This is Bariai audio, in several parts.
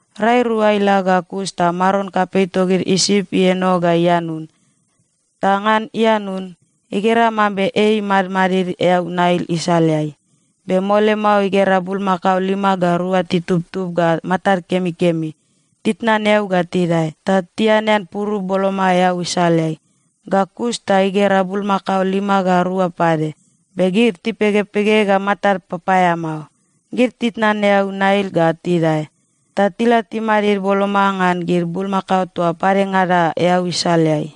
Rai rua ila ga kus ta maron kapei togid Isip ieno ga ianun. Ta ngan ianun, igera mambe ei imadmadid eau Nail isaleai. Be mole mao igera bulmakao lima ga rua titubtub ga matad kemikemi, titnan eau ga tidae. Ta tianean purup boloma eau isaleai. Ga kus ta igera bulmakao lima ga rua pade, be gid tipegepege ga matad papaeamao. Gid titnan eau Nail ga tidae, ta tila timadid boloma ngan gid bulmakao toa padengada eau isaleai.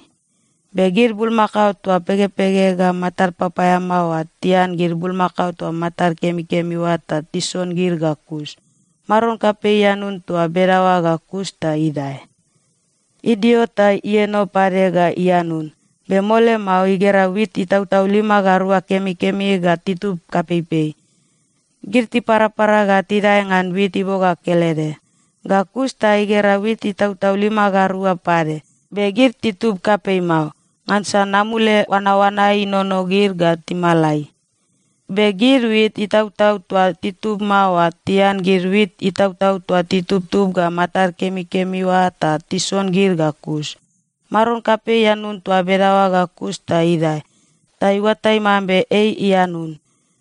Be gid bulmakao toa pegepege ga matad papaeamao oa tian gid bulmakao toa matad kemikemi oa ta tison gid ga kus. Maron kapei ianun toa bedaoa ga kus ta idae. Idio ta ieno pade ga ianun, be mole mao igera wit itautau lima ga rua kemikemi ga titub kapeipei. Gid tiparapara ga tidae ngan wit iboga kelede. Ga kus ta igera wit itautau lima ga rua pade, be gid titub kapei mao, ngansa namule oanaoana inono gid ga timalai. Be gid wit itautau toa titub mao oa tian gid wit itautau toa titubtub ga matad kemikemi oa ta tison gid ga kus. Maron kapei ianun toa bedaoa ga kus ta idae. Ta iuatai mambe ei ianun.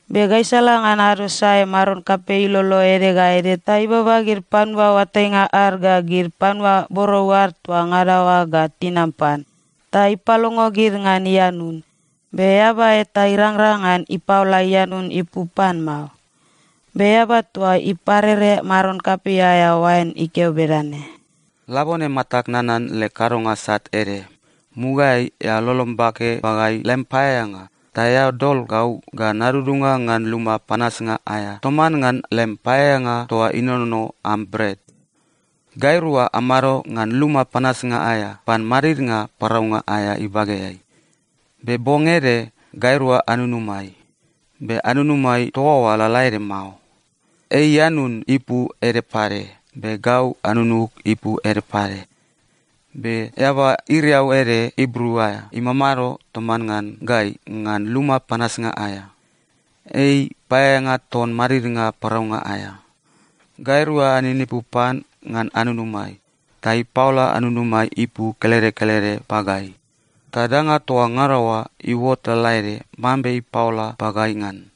Be gaisala ngan ado sae maron kapei ilolo ede ga ede ta ibaba gid panua oatainga ad ga gid panua borou ad toa ngada oa ga tinam pan, ta ipalongo gid ngan ianun. Be eaba eta irangrang ngan ipaola ianun ipu pan mao. Be eaba toa iparere maron kapei aea oain ikeo bedane, “Labone, matag nanan leg kadonga sat ede. Mugaeai eao lolom bake pagai lem paeaeanga ta eao dol gau ga nadudunga ngan luma panasnga aea toman ngan lem paeaeanga toa inonono am bret. Gairua amado ngan luma panasnga aea pan madidnga paraunga aea ibageai. Be bong ede gairua anunumai. Be anunumai toa oa lalaede mao. Ei ianun ipu ede pade, gau anunug ipu ede pade. Be eaba iriau ede Ibru aea imamado toman ngan gai ngan luma panasnga aea. Ei paeaeanga ton madidnga paraunga aea. Gairua aninipu pan ngan anunumai, ta ipaola anunumai ipu kelede kelede pagai. Ta danga toa ngada oa iuot lalaede mambe ipaola pagai ngan.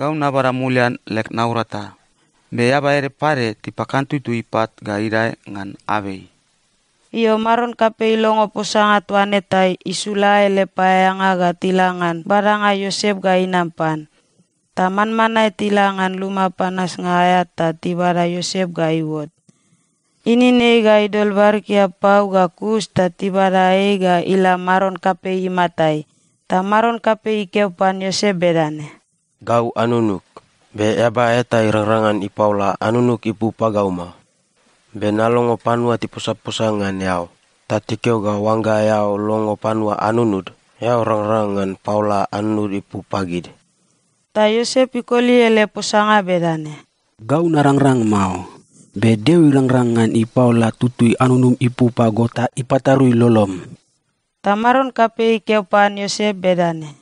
Gau nabada mulian leg naurata. Be eaba ede pade tipakantutu ipat ga idae ngan abei.” Io, Maron kapei ilongo posanga toa ne ta isula ele paeaeanga ga tila ngan badanga Iosep ga inam pan. Ta manmanae tila ngan luma panasnga aea ta tibada Iosep ga iuot. Inin ei ga idol barikia pau ga kus ta tibada ei ga ila maron kapei imatai. Ta maron kapei ikeo pan Iosep bedane, “Gau anunug, be eaba eta irangrang ngan ipaola anunug ipu pagau mao. Be nalongo panua tiposaposa ngan eao ta tikeo ga oangga eao longo panua anunud, eao rangrang ngan paola anunud ipu pagid.” Ta Iosep ikoli ele posanga bedane, “Gau narangrang mao. Be Deo irangrang ngan ipaola tutui anunum ipu pago ta ipatarui lolom.” Ta maron kapei ikeo pan Iosep bedane,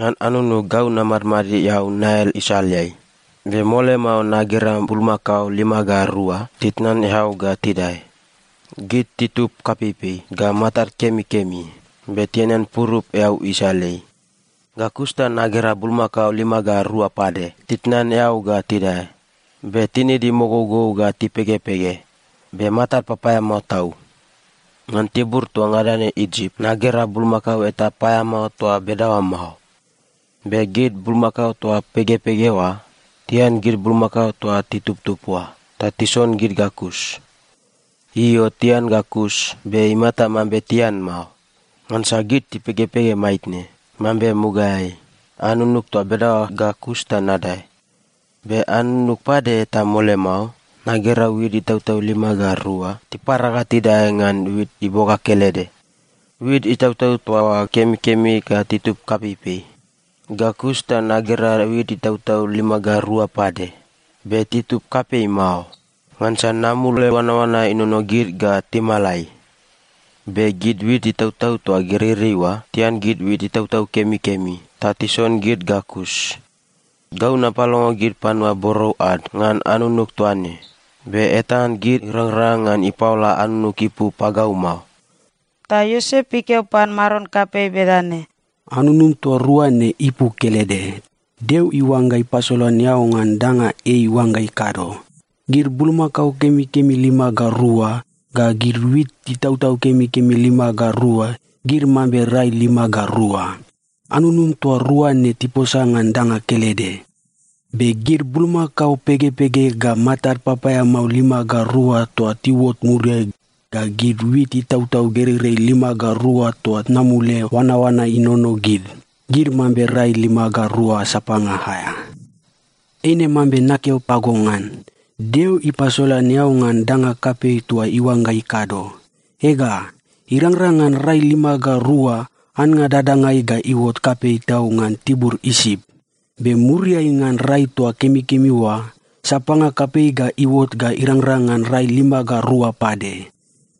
“Ngan anunug gau namadmadid eau Nail isaleai, be mole mao nagera bulmakao lima ga rua titnan eau ga tidae. Gid titub kapeipei ga matad kemikemi, be tianean purup eau isaleai. Ga kus ta nagera bulmakao lima ga rua pade titnan eau ga tidae. Be tinid imogougou ga tipegepege, be matad papaeamao tau. Ngan tibur toa ngada ne Isip, nagera bulmakao eta paeamao toa bedaoa mao. Be gid bulmakao toa pegepege oa tian gid bulmakao toa titubtub oa ta tison gid ga kus. Io, tian ga kus, be imata mambe tian mao, ngansa gid tipegepege maitne, mambe mugaeai. Anunug toa bedaoa ga kus ta nadae. “Be anunug pade ta mole mao nagera wit itautau lima ga rua tipara ga tidae ngan wit iboga kelede. Wit itautau toa oa kemikemi ga titub kapeipei. Ga kus ta nagera wit itautau lima ga rua pade, be titub kapei mao ngansa namule oanaoana inono gid ga timalai. Be gid wit itautau toa gereirei oa tian gid wit itautau kemikemi ta tison gid ga kus. Gau napalongo gid panua borou ad ngan anunug toa ne, be eta ngan gid irangrang ngan ipaola anunug ipu pagau mao.” Ta Iosep ikeo pan maron kapei bedane, “Anunum toa rua ne ipu kelede. Deo iuangga ipasolan eao ngan danga ei iuangga ikado. Gid bulmakao kemikemi lima ga rua, ga gid wit itautau kemikemi lima ga rua, gid mambe rai lima ga rua. Anunum toa rua ne tiposa ngan danga kelede. Be gid bulmakao pegepege ga matad papaeamao lima ga rua toa tiuot muriai ga gid wit itautau gereirei lima ga rua toa namule oanaoana inono gid, gid mambe rai lima ga rua sapanga aea. “Eine mambe nakeo pago ngan. Deo ipasolan eao ngan danga kapei toa iuangga ikado. Ega, irangrang ngan rai lima ga rua, annga dadangai ga iuot kapei tau ngan tibur Isip. Be muriai ngan rai toa kemikemi oa, sapanga kapei ga iuot ga irangrang ngan rai lima ga rua pade.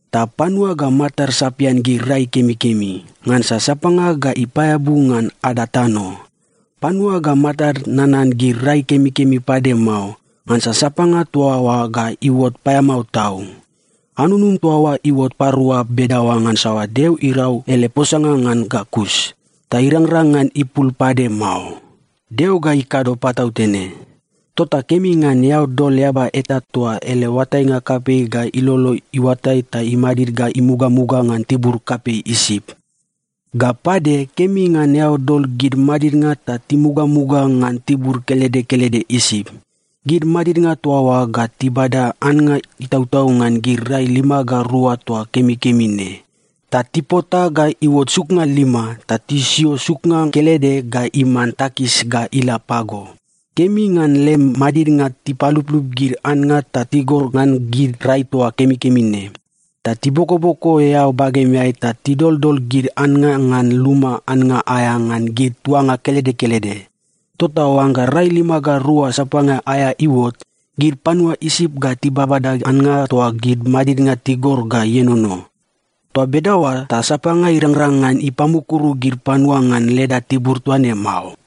Ta panua ga matad sapian gid rai kemikemi, ngansa sapanga ga ipaeabu ngan ada tano. Panua ga matad nanan gid rai kemikemi pade mao, ngansa sapanga toa oa ga iuot paeamao tau. Anunum toa oa iuot parua bedaoa ngansa Deo irau ele posanga ngan ga kus, ta irangrang ngan ipul pade mao. Deo ga ikado patautene. “Tota kemi ngan eao dol eaba eta toa ele oatainga kapei ga ilolo iuatai ta imadid ga mugamuga ngan tibur kapei Isip. Ga pade, kemi ngan eao dol gid madidnga ta timugamuga ngan tibur kelede kelede Isip. Gid madidnga toa oa ga tibada annga itautau ngan gid rai lima ga rua toa kemikemi ne, ta tipota ga iuot suknga lima. Ta tisio suknga kelede ga iman takis ga ila pago. Kemi ngan lem madidnga tipaluplup gid annga ta tigor ngan gid rai toa kemikemi ne. Ta tibokoboko eao bagemeai ta tidoldol gid annga ngan luma annga aea ngan gid tuanga kelede kelede. Tota oangga rai lima ga rua sapanga aea iuot, gid panua Isip ga tibabada annga toa gid madidnga tigor ga ienono. Toa bedaoa ta sapanga irangrang ngan ipamukuru gid panua ngan leda tibur toa ne mao.”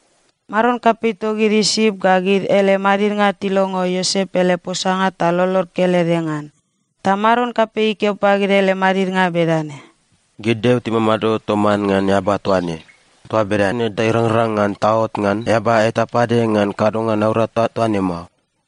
Maron kapei togid Isip ga gid ele madidnga tilongo Iosep ele posanga ta lolod kelede ngan. Ta maron kapei ikeo pagid ele madidnga bedane, “Gid deo timamado toman ngan eaba toa ne. Toa bedane ta irangrang ngan taot ngan eaba eta pade ngan kadonga naurata toa ne mao.”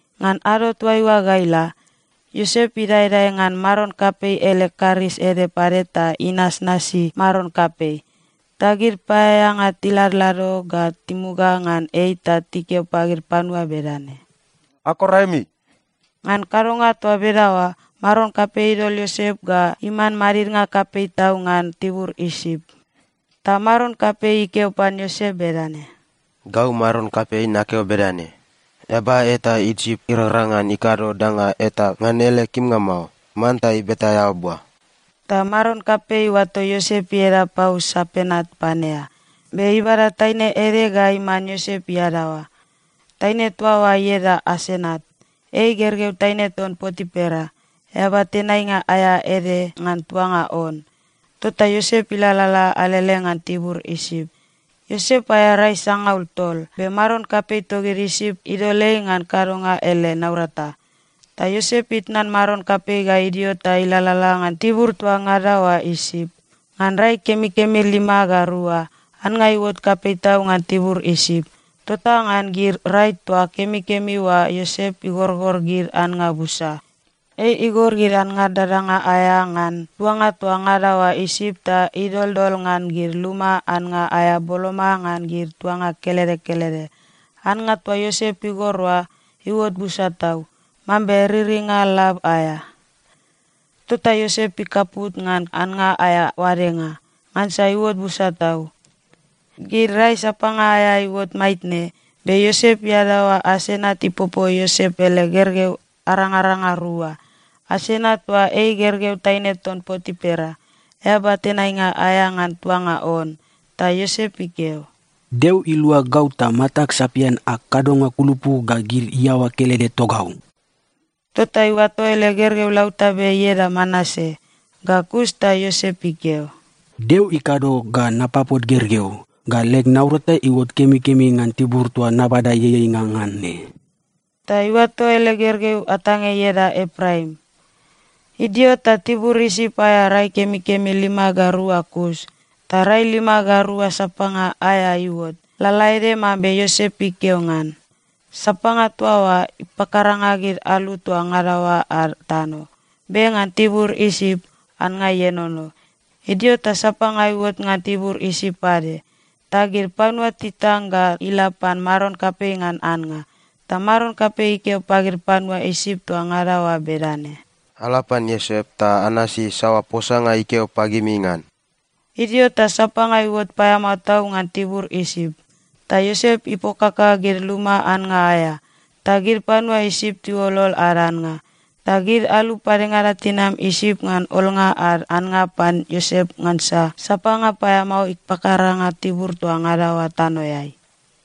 Ngan ado toaiua ga ila, Iosep idaedae ngan maron kapei ele karis ede pade ta inasnasi maron kapei. Ta gid paeaeanga tiladlado ga timuga ngan ei ta tikeo pagid panua bedane, “Akor aemi!” Ngan kadonga toa bedaoa, maron kapei idol Iosep ga iman madidnga kapei tau ngan tibur Isip. Ta maron kapei ikeo pan Iosep bedane, “Gau maron kapei, nakeo bedane: Eaba eta Isip irangrang ngan ikado danga eta ngan ele kimnga mao. Manta ibeta eao bua.” Ta maron kapei iuato Iosep ieda pau Sapenat-Panea. Be ibada taine ede ga iman Iosep iadaoa. Taine toa oa ieda Asenat. Ei gergeu taine ton Potipera, eaba tenainga aea ede ngan tuanga On. Tota Iosep ilalala alele ngan tibur Isip. Iosep aea rai sangaul tol, be maron kapei togid Isip idol ei ngan kadonga ele naurata. Ta Iosep itnan maron kapei ga idio ta ilalala ngan tibur toa ngada oa Isip. Ngan rai kemikemi lima ga rua, annga iuot kapei tau ngan tibur Isip. Tota ngan gid rai toa kemikemi oa Iosep igorgor gid annga busa. Ei igor gid annga dadanga aea ngan tuanga toa ngada oa Isip ta idoldol ngan gid luma annga aea boloma ngan gid tuanga kelede kelede. Annga toa Iosep igor oa, iuot busa tau, mambe riringa lab aea. Tota Iosep ikaput ngan annga aea oadenga, ngansa iuot busa tau. Gid rai sapanga aea iuot maitne, be Iosep iadaoa Asenat ipopo Iosep ele gergeu arangaranga rua. (Asenat toa ei gergeu taine ton Potipera, eaba tenainga aea ngan tuanga On.) Ta Iosep ikeo, “Deo ilua gau ta matag sapian ag kadonga kulupu ga gid iaoa kelede togau.” Tota iuato ele gergeu lautabe ieda Manase. Ga kus ta Iosep ikeo, “Deo ikado ga napapot gergeu, ga leg naurata iuot kemikemi ngan tibur toa nabada ieieinga ngan ne.” Ta iuato ele gergeu atange ieda Epraim. Idio ta tibur Isip aea rai kemikemi lima ga rua kus. Ta rai lima ga rua sapanga aea iuot, lalaede mambe Iosep ikeo ngan. Sapanga toa oa ipakaranga gid alu toa ngada oa ad tano. Be ngan tibur Isip, annga ienono. Idio ta sapanga iuot ngan tibur Isip pade. Ta gid panua titang ga ila pan maron kapei ngan annga. Ta maron kapei ikeo pagid panua Isip toa ngada oa bedane, “Ala pan Iosep ta anasi saoa posanga ikeo pagimi ngan.” Idio ta sapanga iuot paeamao tau ngan tibur Isip, ta Iosep ipokaka gid luma annga aea, ta gid panua Isip tiuolol ad annga. Ta gid alu padengada tinam Isip ngan olnga ad annga pan Iosep, ngansa sapanga paeamao ipakaranga tibur toa ngada oa tanoeai.